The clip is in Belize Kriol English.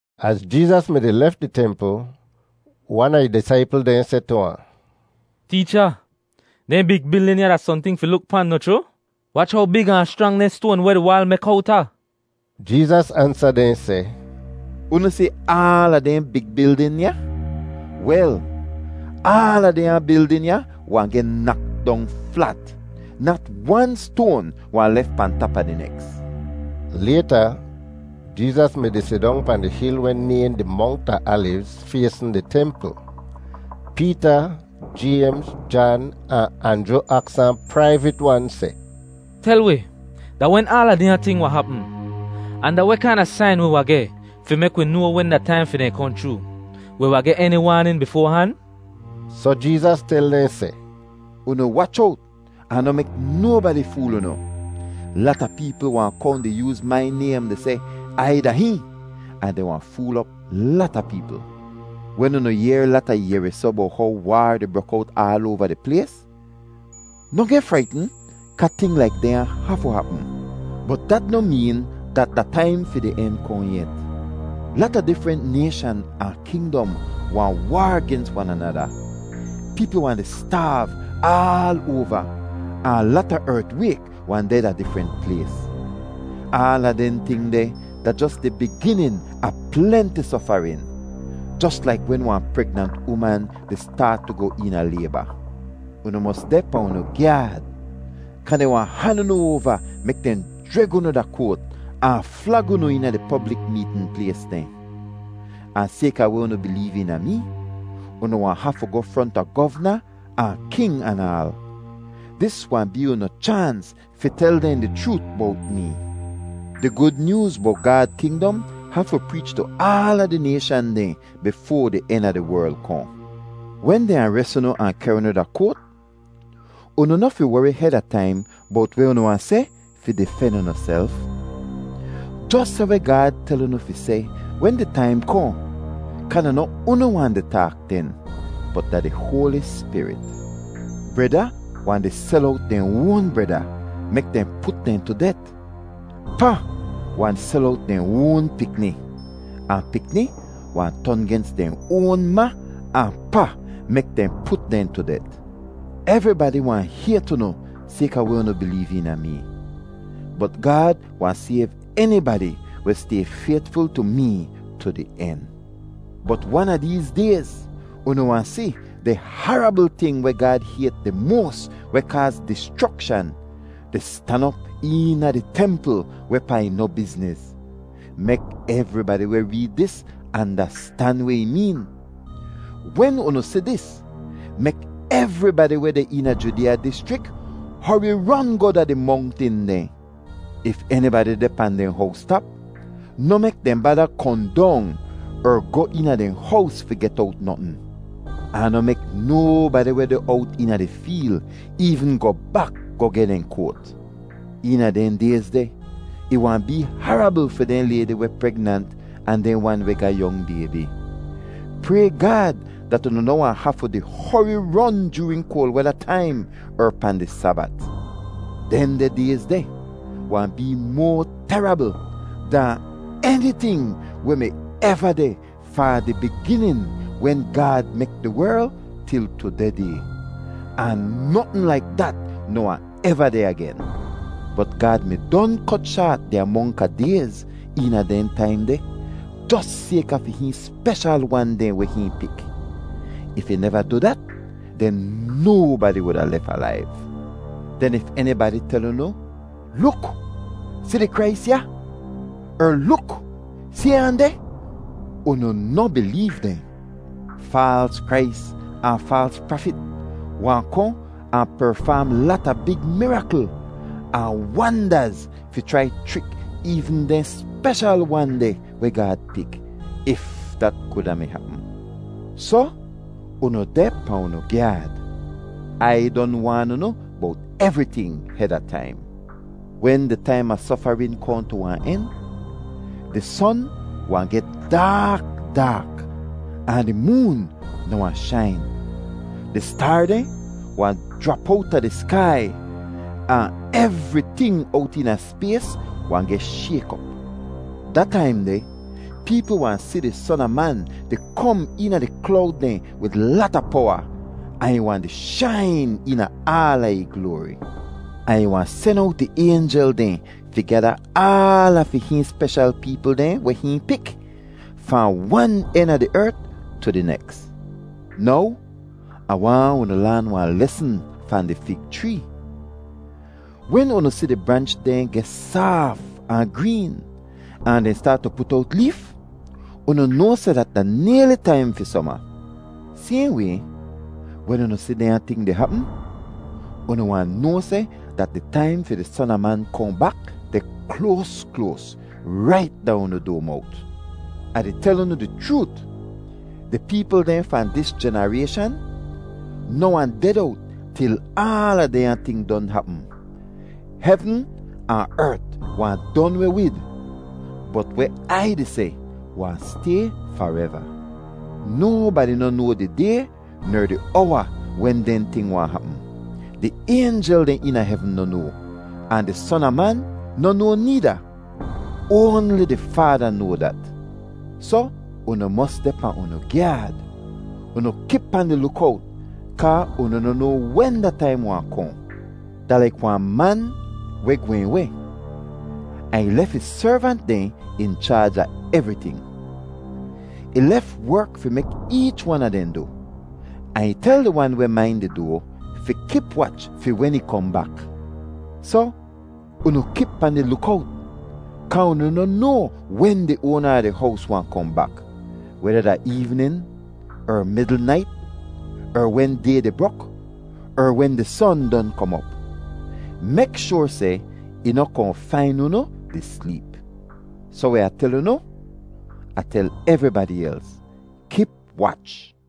Az Jeezas mi-di lef di templ, wan a ih disaipl dehn seh tu ahn, “Teecha, dehn big bildin ya da sohnting fi luk pan, noh chroo? Wach how big ahn schrang dehn stoan weh di waal mek owta!” Jeezas ansa dehn seh, “Unu si aala dehn big bildin ya? Wel, aala dehnya bildin ya wahn geh nak dong flat; nat wan stoan wahn lef pahn tap a di neks.” Layta Jeezas mi-di sidong pahn di hil weh nayhn di Mongt a Alivz faysn di templ. Peeta, Jaymz, Jan, ahn Anjru aks ahn praivit-wan seh, “Tel wi, da wen aala dehnya ting wahn hapm? Ahn da weh kaina sain wi wahn geh fi mek wi noa wen da taim fi dehn kohn chroo? Wi wahn geh eni waanin bifoa han?” Soh Jeezas tel dehn seh, “Unu wach owt ahn noh mek nobadi fool unu. Lata peepl wahn kohn di yooz mai naym di seh, ‘Ai da hihn,’ ahn dehn wahn fool op lata peepl. Wen unu yehr lata yehrisoh bowt how waar di brok owt aal oava di plays, noh geh fraitn kaa ting laik dehnya hafu hapm, bot dat noh meen dat da taim fi di en kohn yet. Lata difrent nayshan ahn kingdom wahn waar gens wan anada. Peepl wahn di staav aal oava ahn lata ertwayk wahn deh da difrent plays. Aala dehn ting deh da jos di biginin a plenti sofarin, jos laik wen wahn pregnant uman di staat tu goh eena layba. “Unu mos deh pahn unu gyaad kaa dehn wahn han unu oava mek dehn jreg unu da koat ahn flag unu eena di poblik meetn plays dehn. Ahn sayka weh unu bileev eena mee, unu wahn hafu goh fronta govna ahn king anaal. Dis wahn bee unu chaans fi tel dehn di chroot bowt mee. Di Gud Nyooz bowt Gaad kingdom hafu preech tu aala di nayshan dehn bifoa di en a di werl kohn. Wen dehn ares unu ahn kehr unu da koat, unu noh fi wori heda taim bowt weh unu wahn seh fi difen unuself. Jos seh weh Gaad tel unu fi seh wen di taim kohn kaa da noh unu wahn di taak den, bot da di Hoali Spirit. “Breda wahn di sel owt dehn oan breda mek dehn put dehn tu det; pa wahn sel owt dehn oan pikni; ahn pikni wahn ton gens dehn oan ma ahn pa mek dehn put dehn tu det. Evribadi wahn hayt unu sayka weh unu bileev eena mee. Bot Gaad wahn sayv enibadi weh stay faytful tu mee tu di en. “Bot wan a deez dayz unu wahn si ‘di harabl ting weh Gaad hayt di moas weh kaaz dischrokshan’ di stan op eena di templ wehpaa ih noh bizniz. (Mek evribadi weh reed dis andastan weh ih meen.) Wen unu si dis, mek evribadi weh deh eena Judeeya dischrik hori ron goh da di mongtin dehn. If enibadi deh pahn dehn howstap, noh mek dehn bada kohn dong er goh eena dehn hows fi get owt notn. Ahn noh mek nobadi weh deh owt eena di feel eevn goh bak goh geh dehn koat. Eena dehn dayz deh ih wahn bee harabl fi dehn laydi weh pregnant ahn dehn wan weh ga yong baybi! Pray Gaad dat unu noh wahn hafu di hori ron joorin koal weda taim er pahn di Sabat. Dehndeh dayz deh wahn bee moa terabl dahn eniting weh mi eva deh fahn di biginin wen Gaad mek di werl til tudeh day. Ahn notn laik dat noh wahn eva deh agen. Bot Gaad mi don kot shaat di amonk a dayz eena dehn taim deh, jos sayka fi hihn speshal wan dehn weh hihn pik. If ih neva du dat, den nobadi wuda lef alaiv. “Den if enibadi tel unu, ‘Luk! Si di Krais ya!’ er ‘Luk! Si ahn deh!’ unu noh bileev dehn. Faals Krais ahn faals prafit wahn kohn ahn perfaam lata big mirakl ahn wandaz fi chrai chrik eevn dehn speshal wan dehn weh Gaad pik, if dat kuda mi hapm. Soh, unu deh pahn unu gyaad! Ai don waan unu bowt evriting heda taim. “Wen di taim a sofarin kohn tu wahn en, ‘di son wahn geh daak daak ahn di moon noh wahn shain. Di staar dehn wahn jrap owta di skai, ahn evriting owt eena spays wahn geh shayk op.’ “Da taim deh peepl wahn si di Son a Man di kom eena di klowd dehn wid lata powa, ahn ih wahn di shain eena aala ih gloari. Ahn ih wahn sen owt ih aynjel dehn fi gyada aala fi hihn speshal peepl dehn weh hihn pik, fahn wan en a di ert tu di neks. “Now Ah waahn unu laan wahn lesn fahn di fig chree: wen unu si di branch dehn geh saaf ahn green ahn dehn staat tu put owt leef, unu noa seh dat da nayli taim fi soma. Sayhn way, wen unu si dehnya ting di hapm, unu wahn noa seh dat di taim fi di Son a Man kohn bak deh kloas kloas, rait da unu doa mowt! Ah di tel unu di chroot, di peepl dehn fahn dis jenarayshan noh wahn ded owt til aala dehnya ting don hapm. “Hevn ahn ert wahn don weh wid, bot weh Ai di seh wahn stay fareva. “Nobadi noh noa di day ner di owa wen dehn ting wahn hapm. Di aynjel dehn eena hevn noh noa, ahn di Son a Man noh noa needa. Oanli di Faada noa dat. Soh unu mos deh pahn unu gyaad. Unu kip pahn di lukowt kaa unu noh noa wen da taim wahn kohn. Da laik wahn man weh gwehn weh, ahn ih lef ih servant dehn in chaaj a evriting. Ih lef werk fi mek eech wan a dehn du, ahn ih tel di wan weh main di doa fi kip wach fi wen ih kohn bak. Soh unu kip pahn di lukowt kaa unu noh noa wen di oana a di hows wahn kohn bak, weda da eevnin er midl nait er wen day di brok, er wen di son don kom op. Mek shoar seh ih noh kohn fain unu di sleep. Soh weh Ah tel unu, Ah tel evribadi els: Kip wach!”